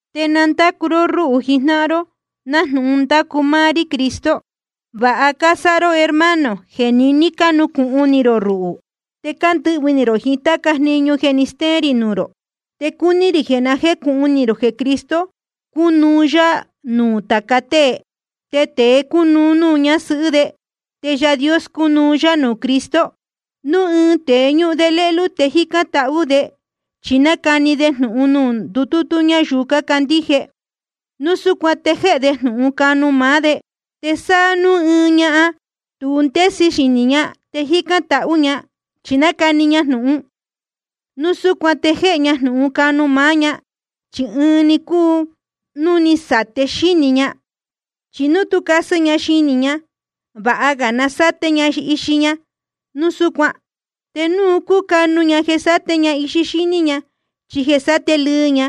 Te na ndácu ró rúhū jijnáhan ró, nájnūhun ndácu máá rí Cristo. Vāha cásáha ró, hermano, jeē niní cánucūhun ni rō ruhū, te cándɨhvɨ̄ ni rō jiín táca jniñu jeē ni steén rī nuū rō. Te cúní rī jeē na jécūhun ni rō jeē Cristo cúnuú yá nuū tāca tée. Te tēe cúnuú de nuū ñasɨhɨ́ de. Te Yaā Dios cúnuú yá nuū Cristo. Núu ɨɨn tēe ñúhun de lélú te jícán tahú de chí nácani de jnūhun nuū ndutútú ñáyuu cácandíje, núu súcuan te jéhe de jnūhun canu máá de. Te sa núu ɨɨn ñahan tu ndésɨ xinī ña te jícán tahú ña chí nácani ña jnūhun, núu súcuan te jéhe ña jnūhun canu máá ña, chi ɨɨn‑ni cúu un núu ní sáte xínī ña. Chi núu tú casɨ ña xinī ña, vāha ga na sáte ña ixi ña núu súcuan. Te núu cúcanu ña jeē sáte ña ixi ña chí jéē sáte lɨɨ ña,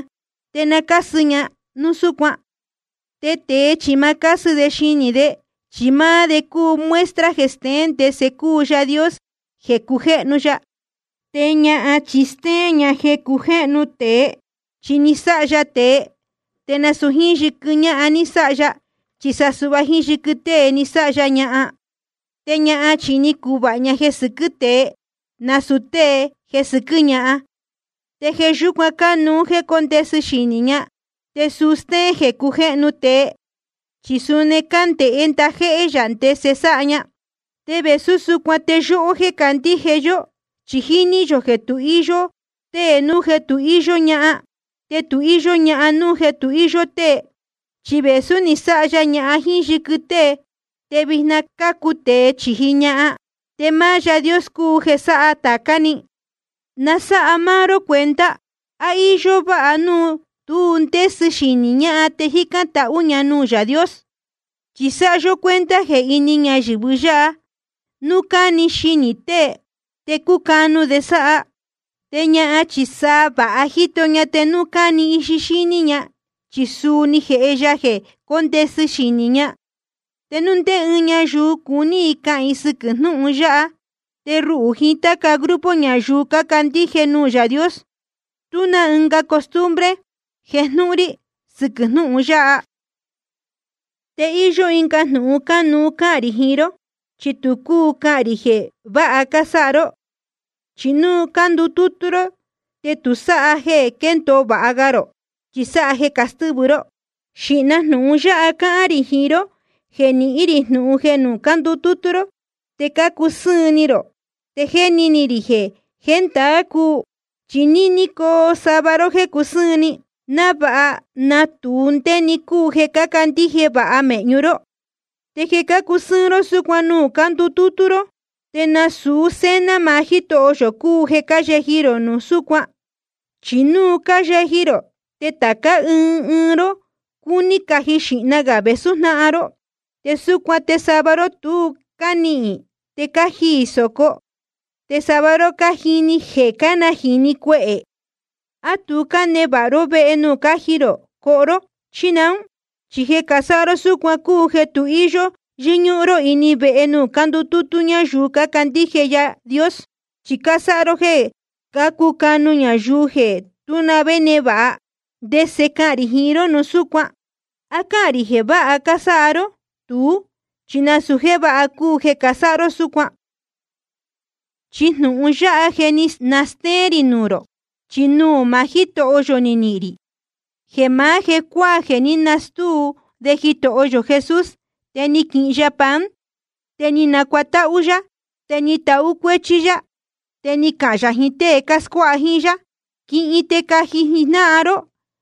te na cásɨ ña núu súcuan. Te tēe chi ma cásɨ de xinī de, chi máá de cúu muestra jeē steén ndese cúu Yaā Dios jeē cujéhnu ya. Te ñahan chi stéén ña jeē cujéhnu tēe. Chi ná ni sáha ya tēe, te nasūu jíín yɨquɨ ñáhan ni sáha ya, chi sa suhva jíín yɨquɨ tée ni sáha ya ñahan. Te ñahan chi ni cuvāha ña jeē sɨquɨ́ tée, nasūu tée jeē sɨquɨ́ ñahan. Te jeē yúcuan cánuú jéē cóndesɨ xinī ñahan, te suu stéén jeē cujéhnu tēe, chi suni cándēhé ndajéhé yā ndese sáha ña. Te vēsú súcuan te yóhó jéē candíje yó, chi jíní yō jeē tu íyó tée núu jeē tu íyó ñahan, te tu íyó ñahan núu jeē tu íyó tée. Chi vēsú ni sáha ya ñahan jíín yɨquɨ tée, te vijna cácu tēe chīji ñahan, te máá Yaā Dios cúu jeē sáha tācá‑ni. Na sáha máá ró cuenta ¿á íyó váha núu tu ndésɨ xinī ñahan te jícán tahú ña nuū Yaā Dios? Chi sáha yó cuenta jeē ini ñayɨ̄vɨ yáha, núu cáni ixi tēe te cúcanu de sáha. Te ñahan chi sa vāha jíto ña te núu cáni ixi ña, chi suu ni jēhe ya jeē cóndesɨ xinī ña. Te núu ndé ɨɨn ñayuu cuní i cahān i sɨquɨ̄ jnúhun yáha, te ruhū jiín táca grupo ñayuu cácandíje nuū Yaā Dios, tú na ɨnga costumbre jejnúhún rí sɨquɨ̄ jnúhun yáha. Te íyó ɨnga jnūhun cánuú cahān rī jiín ró, chi tu cúu cahān rī jeē vāha cásáha ró. Chi nuū cándutútú ró te tu sáha jeē quéndōo vāha ga rō, chi sa jeē castɨ́vɨ ró. Xīhna jnūhun yáha cáhán rī, jeē nihín rī jnūhun jeē nuū cándutútú ró te cácusɨ́ɨn ni rō. Te jéni ni rī jeē ndaā cúu. Chi níní coo sava ró jéē cusɨ́ɨn ni, návāha natūu ndé‑ni cúu jeē cácandíje vāha mēhñu ró. Te jeē cácusɨ́ɨn ró súcuan nuū cándutútú ró, te nasūu cena maá Jítoho yō cúu jeē cáyeji rō núu súcuan. Chi núu cáyeji rō, te tācá ɨɨn ɨɨn ró cúní caji xīhna gā vēsú jnáhan ró. Te súcuan te sava ró tu cánihīn, te cájiī sōco, te sava ró cánajīni jeē cájihi cuehē. ¿A tu cánevāha ró vehe nuū cáji rō coho ró, chí naún? Chi jeē casáha ró súcuan cúu jeē tu íyó yɨ́ñúhún ró ini vehe nuū cándutútú ñáyuu cácandíje Yaā Dios, chi cásáha ró jéē cácucanu ñayuu jeē tú na vé névāha. ¿Ndese cahān rī jiín ró núu súcuan? ¿A cáhān rī jeē vāha cásáha ró? Tuú chi nasūu jéē váha cúu jeē casáha ró súcuan. Chi jnūhun yáha jéē ní nastéén rī nuū rō, chi nuū maá Jítoho yō ni nihīn rī: Jeē maá jecuáā jeē ní nastúu de Jitoho yō Jesús, te ni quihin ya pan. Te ni nacuatáhú yá, te ni tahú cuéchí yá, te ni cahān yā jiín tée cáscuáha jíín yá: Quihin te caji rō jijnáhan ró,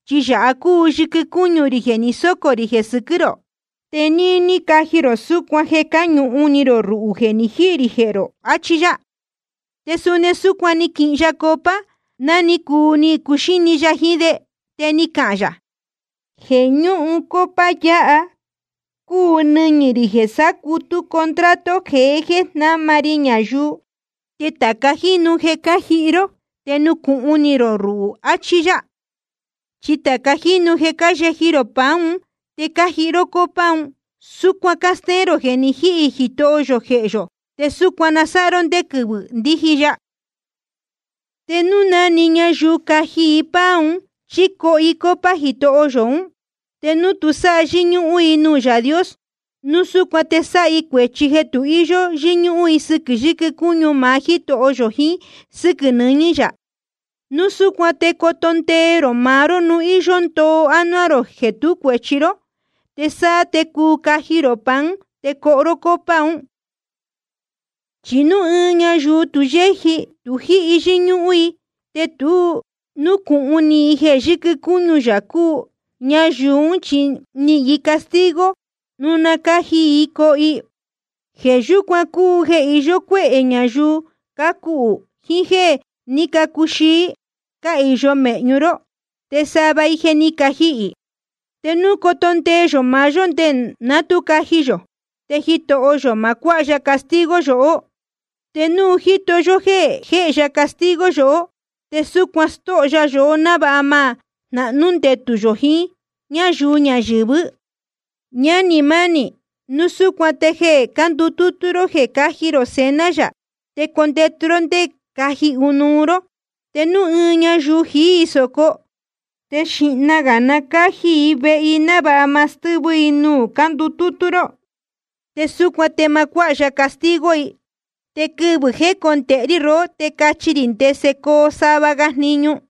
chi yāha cúu yɨquɨ cúñu rī jeē ni sócō rī jeē sɨquɨ́ rō. Te níní caji rō súcuan jeē cáñuhun ni rō ruhū jeē ni jíhī rī jehē rō. Achí yá. Te suni súcuan ni quihin ya copa ná ni cuu ni cuxíni ya jiín de, te ni cahān yā: Jeē ñúhun copa yáha cúu nɨñɨ̄ rī jeē sácutú contrato jeé jeē jnáma ri ñayuu. Te tāca jínu jeē cájihi ró, te nucūhun ni rō ruhū. Achí yá. Chi tāca jínu jeē cáyeji rō pan un te cájihi ró copa un, súcuan cástéén rō jeē ni jíhī Jitoho yō jehē yō. Te súcuan na sáha ró ndé quɨvɨ̄ ndíji ya. Te núu na‑ni ñayuu caji i pan un chí coho i copa Jitoho yō ún, te núu tu sáha yɨ́ñúhún i nuū Yaā Dios, núu súcuan te sáha i cuēchi jeē tu íyó yɨ́ñúhún i sɨquɨ̄ yɨquɨ cúñu maá Jítoho yō jiín sɨ́quɨ̄ nɨñɨ̄ yā. Núu súcuan te coto ndee rō maá ró núu íyó ndoo ánuá rō jeē tú cuēchi ró. Te sáá te cuu caji rō pan un te coho ró copa un. Chi núu ɨɨn ñayuu tu yéji tu jíhi yɨ́ñúhún i te tu núcūhun ni i jeē yɨquɨ cúñu yā cúu, ñayuu ún chi nihīn i castigo núu na cáji i coho i. Jeē yúcuan cúu jeē iyó cuéhē ñayuu cácuhū jiín jéē ní cacuxií, cáhīyo mēhñu ró. Te sava i je ni cajihī. Te núu coto ndee yō maá yó nde ná tu caji yō, te Jitoho yō ma cuáha ya castigo yohó. Te núu Jitoho yō jéhe ya castigo yohó, te súcuan stóho ya yohó návāha ma jnahnú ndetū yō jiín ñáyuu ñayɨ̄vɨ́. Ñánī mánī, núu súcuan te jeē cándutútú ró jeē cáji rō Cena yā, te condetu ró te caji ɨnuú ró. Te núu ɨɨn ñayuu jií i sōco, te xīhna gā na cáji i vehe i návāha ma stɨ́vɨ i nuū cándutútú ró. Te súcuan te ma cuáha ya castigo i. Te quɨvɨ̄ jécondēhe rí rohó te cachi rī ndese coo sava ga jniñu.